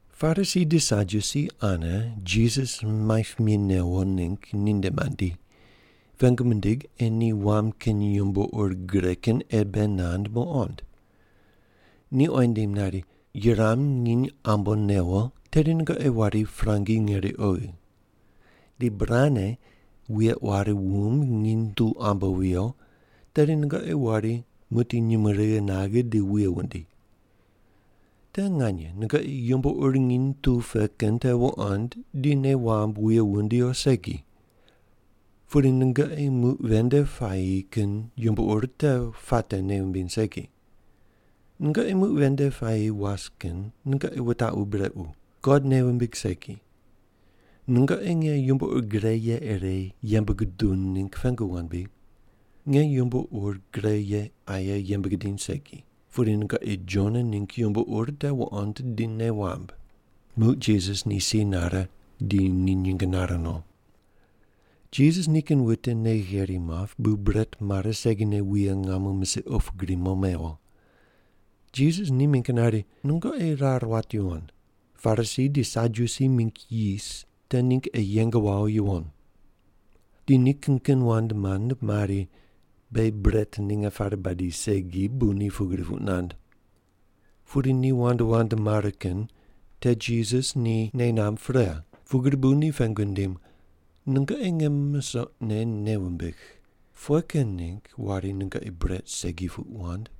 Parisi di Sadyusi ane Jisas maip mi newo ningg ninde mandi, pengu mindig ei ni wam kin yumbo ur gre kin ire bei nand muqond. Ni oyi nindim nari, “Yuram nginy ambo newo tedi nungoqi wari prangi ngeri oghi. Di burane wuye quari wumb nginy tu ambo viyo, tedi nungoqi wari muqdi nyumurighi naghe di wuye wundi. Te nganye nungoqi yumbo ur nginy tu pe kin te wuqond di nei wamb wuye wundi o segi, pudi nungoqi muq ven nde puayi kin yumbo ur te puate nei wumbiny segi. Nungoqi muq ven nde puayi was kin nungoqi wutaqu brequ, God nei wumbig segi. Nungoqi nge yumbo ur gre ye ire yembe guduw ningg pengu wand bri? Nge yumbo ur gre ye aye yembe gidiny segi, pudi nungoqi Jona ningg yumbo ur te wuqond di nei wamb.” Muq Jisas ni si nare di ni nyinge nare no. Jisas nikin wute nei gheri map bu bret mare segine wuye ngamo misiq opu gri mo mewo. Jisas ni mingg nari, “Nungoqi rar wat yuwon, Parisi di Sadyusi mingg yis te ningg ei yeng wawo yuwon.” Di ni kin kin wand mand mari, “Beghi bret ninge pare badi segi bu ni pugri puq nand.” Pudi ni wand wand mare kin te Jisas ni nei namb pre, pugri bu ni pengu nindim, “Nungoqi nge musoqne nei wumbigh, pughe kin ningg wari nungoqi bret segi puq wand?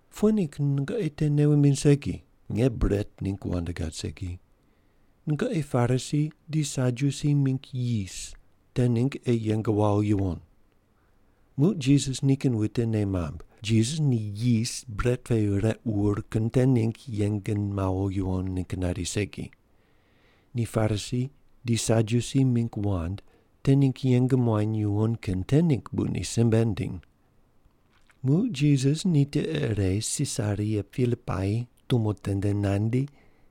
Pughe ningg nungoqi te nei wumbiny segi? Nge bret ningg wand gad segi. Nungoqi Parisi di Sadyusi mingg yis te ningg ei yeng wawo yuwon.” Muq Jisas nikin wute nei mamb, Jisas ni yis bret pe req wur kin te ningg yeng mawo yuwon ningg nari segi. Ni Parisi di Sadyusi mingg wand te ningg yeng muany yuwon kin te ningg bu ni simbe nindim. Muq Jisas ni tiqe ire Sisaria Pilipai tumo tende nandi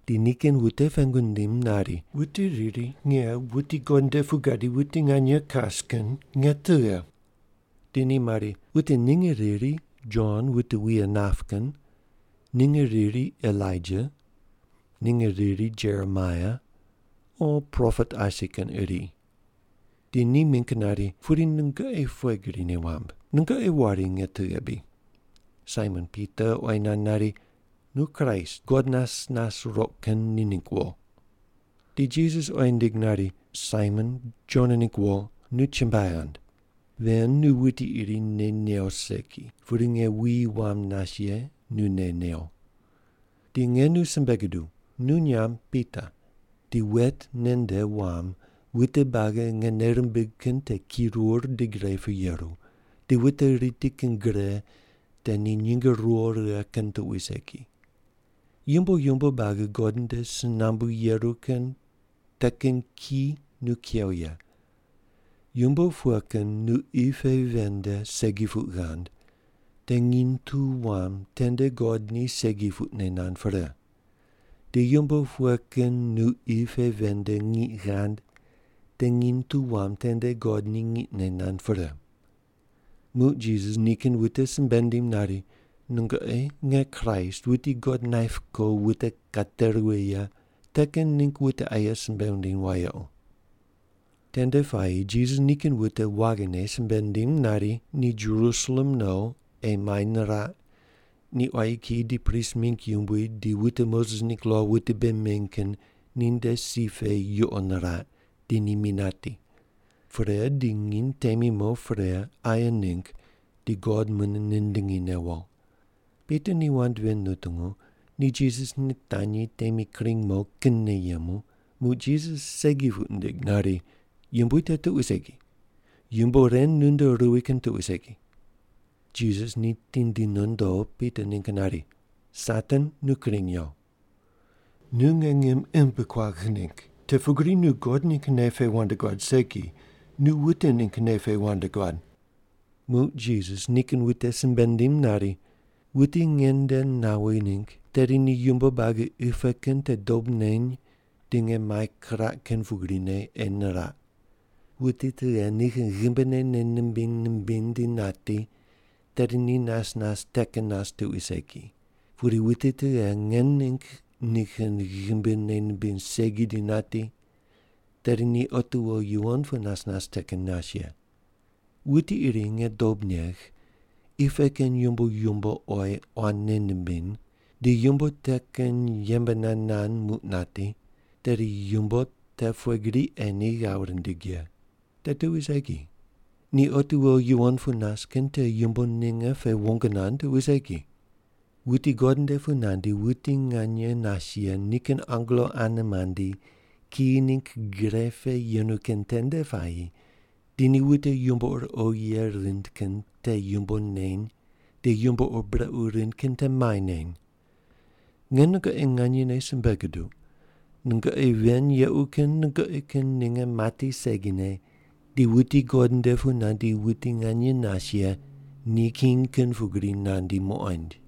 di nikin wute pengu nindim nari, “Wute riri nge, wuti God nde pu gadi wuti nganye kas kin, nge tughe?” Di ni mari, “Wute ninge riri Jon wute wuye nap kin, ninge riri Elaija, ninge riri Jeremaia, o propet asi kin iri.” Di ni mingg nari, “Pudi nungoqi pughe gri nei wamb? Nungoqi wari nge tughe bri?” Saimon Pita oyi nand nari, “Nu Kraist, God nas nas roq kin ni ningg wo.” Di Jisas oyi nindig nari, “Saimon, Jona ningg wo, nu chumbuai ghand. Ven nu wuti iri nei new segi, pudi nge wuyi wam nas ye nu nei new. Di nge nu simbe guduw, nu nyamb Pita, di wet nen nde wam wute buagi nge nei rimbigh kin te kirur di gre pu yeru, di wute riti kin gre te ni nyinge ruwo righe kin tuqui segi. Yumbo yumbo buagi God nde si nambu yeru kin te kin ki nu kew ye. Yumbo pughe kin nu qi pe ven nde segi puq ghand te nginy tu wam tende God ni segi puqne nand pre, di yumbo pughe kin nu qi pe ven nde ngiq ghand te nginy tu wam tende God ni ngiqne nand pre.” Muq Jisas nikin wute simbe nindim nari, “Nungoqi nge Kraist, wuti God naip ko wute kate ruwi ye, te kin ningg wute aye simbe wundiny wayequ.” Tende puayi Jisas nikin wute waghine simbe nindim nari, ni Jerusalem no ei mai niraq, ni quayi kiyi di prist mingg yumbui di wute Moses ningg lo wute bei meny kin ninde si pe yuqo niraq di ni mi nati. Pre di nginy temi mo pre aye ningg di God mune nindingi newo. Pita ni wand ven nutungu ni Jisas nitanyi temi kring mo kinne yemu, muq Jisas segi puq nindig nari, “Yumbui, te tuqui segi. Yumbo ren nunde ruwi kin tuqui segi.” Jisas ni tindi nondo Pita ningg nari, “Satan, nu kring yo! Nu nge ngim imb kuagh ningg, te pugri nu God ningg nei pe wand guad segi, nu wute ningg nei pe wand guad.” Muq Jisas nikin wute simbe nindim nari, “Wuti nge nde nawi ningg, tedi ni yumbo buagi qi pe kin te dob neny di nge mai kiraq kin pugrine ei niraq. Wuti tughe nikin ghimbine nei nimbiny nimbiny di nati, tedi ni nas nas te kin nas tuqui segi, pudi wuti tughe nge ningg nikin ghimbi nei nimbiny segi di nati, tedi ni otiwo yuwon pu nas nas te kin nas ye. Wuti iri nge dob negh, qi pe kin yumbo yumbo oyi quan nei nimbiny, di yumbo te kin yembe nand nand muq nati, tedi yumbo te pughe gri ei ni ghav rindig ye? Te tuqui segi. Ni otiwo yuwon pu nas kin te yumbo ninge pe wong nand tuqui segi. Wuti God nde pu nandi wuti nganye nas ye nikin angelo ane mandi kiyi ningg gre pe yenu kin tende puayi di ni wute yumbo ur oghi ye rind kin te yumbo neny di yumbo ur brequ rind kin te mai neny. Nge nungoqi nganyene simbe guduq, nungoqi ven yequ kin nungoqi kin ninge mati segine di wuti God nde pu nandi wuti nganye nas ye ni king kin pugri nandi muqoind.”